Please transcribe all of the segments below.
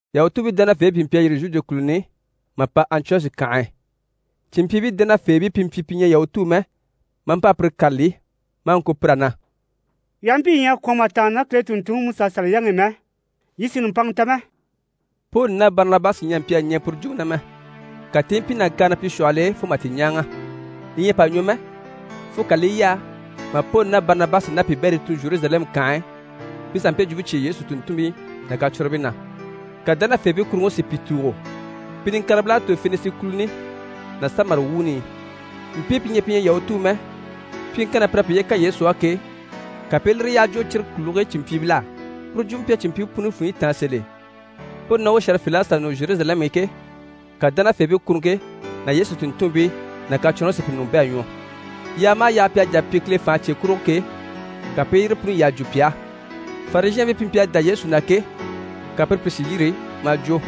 Yahutuubii dánafeebii pìi mpyi a yîri Zhude kùluni i mà pa Antiyɔshi kànhe e, cìnmpyiibii dánafeebii pi mpyi pi ɲyɛ Yahutuu mɛ, maa mpa a pire kâlali maa ŋko pir'á na: «Yii aha mpyi yii ɲyɛ a kwɔ̀n mà tàanna ná Kile tùnntunŋiMusaSaliyaŋi i mɛ, yii sì nùmpanŋa ta mɛ.» Poli ná Barinabasi ɲyɛ a mpyi a ɲɛɛ puru jwumpe na mɛ, ka ti i mpyi nàkaana pi shwɔhɔl'e fo mà ti ɲáaŋa. Li ɲyɛ a pa ɲwɔ mɛ fo ka li i yaa mà Poli ná Barinabasi ná piibɛrii tun Zheruzalɛmu kànhe e, pi sà mpe jwumpe cyêe Yesu tùnntunmpii ná kacwɔnribii na. Ka dánafeebii kuruŋke si pi tùugo. Pi niŋkaribil'à tòro Fenisi kùluni ná Samari wuuni i. Mpii pi ɲyɛ pi ɲyɛ Yahutuu mɛ, pyiŋkanni na pir'à piye kan Yesu á ke, ka pi i lire yyaha jwo cyire kùligii cìnmpyiibil'á. Puru jwumpe mpyi a cìnmpyiibii puni funɲyi táan sèl'e. Poli ná u shɛ̀rɛfeebil'à sà nɔ Zheruzalɛmu i ke, ka dánafeebii kuruŋke ná Yesu tùnntunmpii ná kacwɔnribii si pi ɲùŋɔ bɛ̂ a ɲwɔ. Yaaga maha yaaga pi à jà a pyi Kile fànhe cye kurugo ke, ka pi i yire puni yyaha jwo pi á. Farizhɛɛnbii pi mpyi a dá Yesu na ke, ka pire pìi si yîri maa jwo: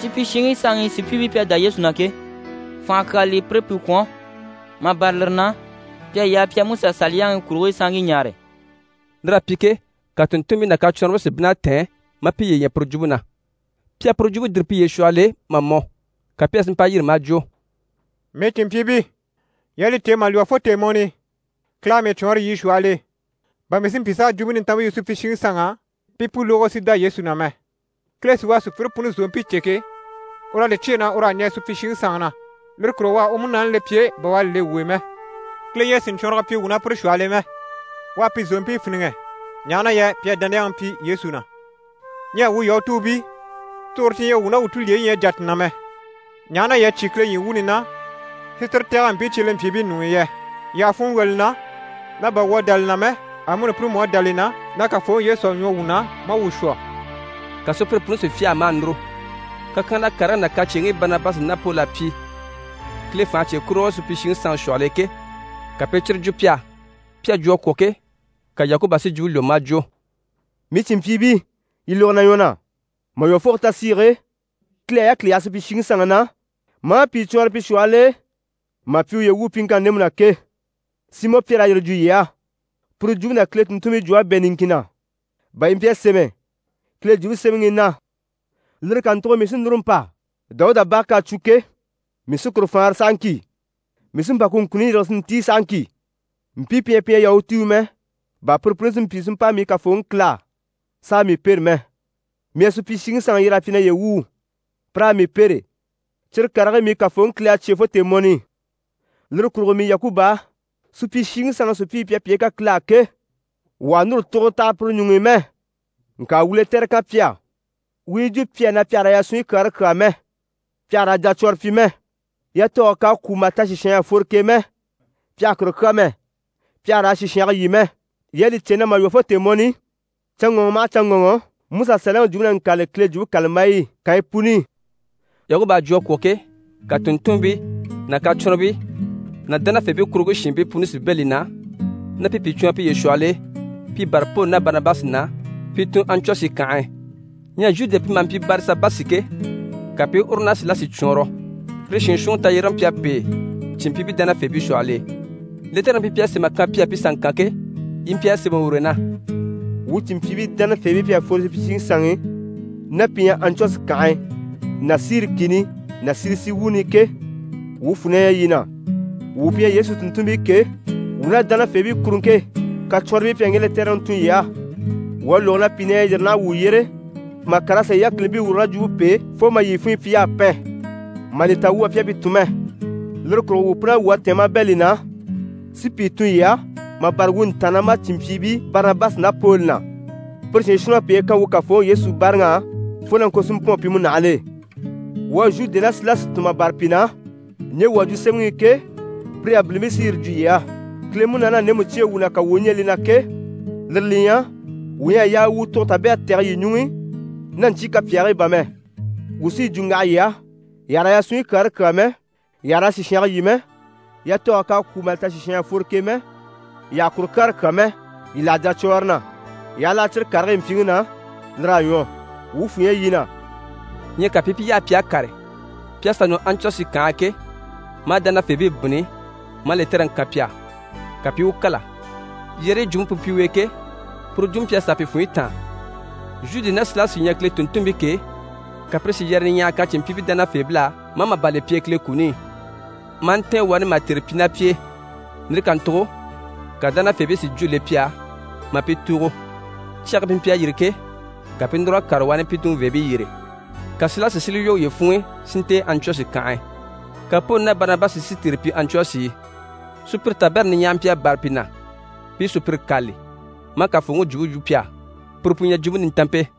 «Supyishiŋi sanŋi sùpyiibii pi à dá Yesu na ke, fànha kyaa li pire pi kwɔ̀n, mà bâra lire na, pi à yaa pi a Musa Saliyaŋi kurigii sanŋkii ɲaare.» Lir'à pyi ke, ka tùnntunmpii ná kacwɔnribii si bínn'a tɛ̀ɛn, maa piye ɲya puru jwumpe na. Pi à puru jwumpe dìri piye shwɔhɔl'e mà mɔ, ka Pyɛri si mpa yîri maa jwo: «Mii cìnmpyiibii, yii à li cè, mà lwɔ́ fo tèemɔni i Kile à mii cwɔɔnrɔ yii shwɔhɔl'e, bà mii si mpyi s'a Jwumpe Nintanmpe yu supyishiŋi sanŋ'á, pi i pu lógo, si dá Yesu na mɛ. Kile sí u à sùpyire puni zòompii cè ke, ur'à li cyêe na ur'à ɲɛɛ supyishiŋi sanŋi na, lire kurugo u à u Munaani le pi e bà u à li le wuu e mɛ. Kile ɲyɛ a sìɲcwɔɔnrɔgɔ pyi wuu ná pire shwɔhɔl'e mɛ. U à pi zòompii fíniŋɛ, ɲaha na yɛ pi à dániyaŋi pyi Yesu na. Ɲyɛ wuu Yahutuubii, tugure ti ɲyɛ wuu ná wuu tulyeyi ɲyɛ a jà ti na mɛ, ɲaha na yii à cyé Kile ɲyii wuuni na si tire tɛ̀gɛ mpii cyelempyiibii ɲuŋ'i yɛ? Yii àha funŋɔ wwɔ̀ li na na bà wuu à dá li na mɛ, amuni pire mú à dá li na na Kafooŋi Yesu à ɲwɔ wuu na maa wuu shwɔ.» Ka sùpyire puni si fyâha maa núru, kakyanhala karigii ná kacyeeŋkii Barinabasi ná Poli à pyi Kile fànhe cye kurugo supyishiŋi sanŋi shwɔhɔl'e ke, ka pi i cyire jwo pi á. Pi à jwo a kwɔ̀ ke, ka Yakuba si jwumpe lwɔ́ maa jwo: «Mii cìnmpyiibii, yii lógo na ɲwɔ na. Mà lwɔ́ fo ku tasiige e, Kile à yákili yaha supyishiŋi sanŋi na, maa pìi cwɔɔnrɔ pi shwɔhɔl'e mà pyi uye wuu pyiŋkanni ndemu na ke, Simɔ Pyɛri à yire jwo yii á. Puru jwumpe ná Kile tùnntunmpii jwump'à pa bɛ̂ niŋkin na, bà yi mpyi a sémɛ Kile Jwumpe Semɛŋi i na “Lire kàntugo mii sí núru n‑pa, Dawuda bage k'à cwo ke, mii sí kuru faanra sahaŋki. Mii sí n‑pa ku ŋkunuɲyi yîrige si ntíi sahaŋki, Mpii pi ɲyɛ pi ɲyɛ Yahutuu mɛ, bà pire puni si mpyi si mpa mii Kafooŋi Kile á, s'a mii pêre mɛ. Mii à supyishiŋi sanŋi yyer'a pyi naye wuu, pi raa mii pêre. Cyire karigii mii Kafooŋi Kile à cyêe fo tèemɔni i.” Lire kurugo mii Yakuba á, supyishiŋi sanŋi sùpyiibii pi à piye kan Kile á ke, wuu àha núru tuguro taha pire ɲuŋ'i mɛ. Ŋka wuu lɛtɛrɛ kan pi á, wuu u yi jwo pi á na pi àha raa yasunɲyi kyaare kyàa mɛ, pi àha raa jacwɔrɔ pyi mɛ, yatɔɔge k'à kwû mà ta sìshan ɲyɛ a fworo k'e mɛ, pi àha kuru kyà mɛ, pi àha raa sìshange lyî mɛ. Yii à li cè na mà lwɔ́ fo tèemɔni i, canŋɔŋɔ maha canŋɔŋɔ, Musa Saliyaŋi jwumpe na ŋkâlali Kile Jwumpe kàlambayi i kànyi puni i.» Yakuba a jwo a kwɔ̀ ke, ka tùnntunmpii ná kacwɔnribii ná dánafeebii kuruŋke shiinbii puni si bɛ̂ li na na pi pìi cwɔɔnrɔ piye shwɔhɔl'e pi bâra Poli ná Barinabasi na, pi tun Antiyɔshi kànhe e. Ɲyɛ Zhude pi maha mpyi Barisabasi ke, ka pi i uru ná Silasi cwɔɔnrɔ, pire shiin shuunniŋi tayyérege mpyi a pêe cìnmpyiibii dánafeebii shwɔhɔl'e. Lɛtɛrɛŋi pi mpyi a sém'a kan pi á pi sà ŋkan ke, yi mpyi a sémɛ ur'e na: «Wuu cìnmpyiibii dánafeebii pi à fworo supyishiŋi sanŋi i ná pi ɲyɛ Antiyɔshi kànhe ná Siri kìni ná Silisi wuuni i ke, wuu fwù na ɲyɛ yii na. Wuu pi ɲyɛ Yesu tùnntunmpii ke, wuu ná dánafeebii kuruŋke kacwɔnribii pi à ŋge lɛtɛrɛŋi tun yii á. Wuu à lógo na pìi na ɲyɛ a yîri naha wuu yyére mà kàr'a sà yii yákilibii wùrugo ná jwumpe p'e fo mà yii funɲyi pyi y'à pɛn, mà li ta wuu bà pi à pi tun mɛ. Lire kurugo wuu pun'à wwɔ̀ a tɛ̀ɛn maa bɛ̂ li na, si pìi tun yii á, mà bâra wuu ntàannamacinmpyiibii Barinabasi ná Poli na. Pire shiin shuunniŋ'à piye kan wuu Kafooŋi Yesu báaraŋ'á fo na ŋko si mpɔ̂ɔn pi múnahigil'e. Wuu à Zhude ná Silasi tun mà bâra pi na, ɲje wuu à jwo sémɛŋi i ke, pire yabilimpii sí yire jwo yii á. Kile Munaani à ndemu cyêe wuu na, ka wuu u ɲɛɛ li na ke, lire li ɲyɛ, wuu ɲyɛ a yaa wuu tugure tabɛrɛ tɛ̀gɛ yii ɲuŋ'i, ná ɲcyii kapyaagii bà mɛ. Wuu sí yi jwo n‑waha yii á, yii àha raa yasunɲyi kyaare kyàa mɛ, yii àha raa sìshange lyî mɛ, yatɔɔge k'à kwû mà ta sìshan ɲyɛ a fworo k'e mɛ, yii àha kuru kyaare kyà mɛ, yii láha jacwɔɔre na. Yii aha láha cyire karigii mpyiŋi na, lir'à ɲwɔ. Wuu fwù ɲyɛ yii na.» Ɲyɛ ka pi i pi yaha pi à kàre. Pi à sà nɔ Antiyɔshi kànhe e ke, maa dánafeebii bínni, maa lɛtɛrɛŋi kan pi á. Ka pi i u kâla, yɛrɛyi jwumpe pu mpyi u e ke, puru jwumpe mpyi a sàa pi funɲyi táan. Zhude ná Silasi u ɲyɛ Kile tùnntunmpii ke, ka pire si yɛrɛyɛ niɲyahaya kan cìnmpyiibii dánafeebil'á, maa màban le pi e Kile kuni i, maa ntɛ̀ɛn wani mà tère pyi ná pi e. Lire kàntugo ka dánafeebii si jwó le pi á, maa pi tùugo. Cyage e pi mpyi a yîri ke, ka pi i núr'a kàre wani pi tunveebii yyére. [ Ka Silasi si li lwɔ́ uye funŋ'i si ntɛ̀ɛn Antiyɔshi kànhe e.] Ka Poli ná Barinabasi si tère pyi Antiyɔshi e. Sùpyire tabɛrɛ niɲyahara mpyi a bâra pi na, pi i sùpyire kâlali, maa Kafooŋi jwumpe yu pi á, puru pu ɲyɛ Jwumpe Nintanmpe.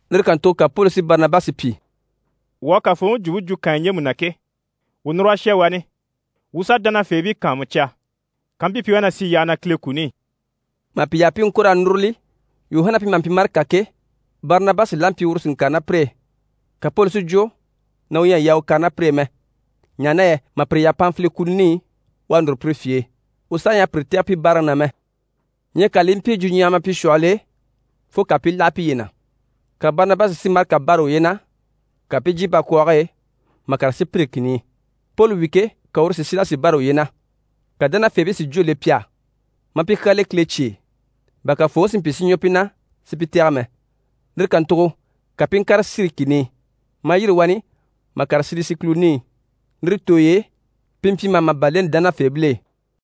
Lire kàntugo ka Poli si Barinabasi pyi: «Wuu à Kafooŋi jwumpe jwo kànyi ɲjemu na ke, wuu núr'a shà wani, wuu sà dánafeebii kàanmucya kampyi pi wá na sì yyaha na Kile kuni i.» Mà pi yaha pi i ŋko raa núruli, Yuhana pi maha mpyi Marika ke, Barinabasi la mpyi uru si ŋkàre ná pire e. Ka Poli si jwo na u ɲyɛ a yaa u kàre ná pire e mɛ, ɲaha na yɛ mà pire yaha Panfili kùluni i, u à núru pire fye e, u saha ɲyɛ a pire tɛ̀gɛ pi báaraŋi na mɛ. Ɲyɛ ka li i mpyi jwuɲyahama pi shwɔhɔl'e fo ka pi i láha piye na. Ka Barinabasi si Marika bâra uye na, ka pi i jyè bakwɔɔge e, mà kàre Sipiri kìni i. Poli wi ke, ka uru si Silasi bâra uye na. Ka dánafeebii si jwó le pi á, maa pi kyaa le Kile cye e, bà Kafooŋi si mpyi si ɲwɔ pi na, si pi tɛ̀gɛ mɛ. Lire kàntugo ka pi i ŋkàre Siri kìni i, maa yîri wani mà kàre Silisi kùluni i. Lire tooy'e, pi mpyi maha màban leni dánafeebil'e.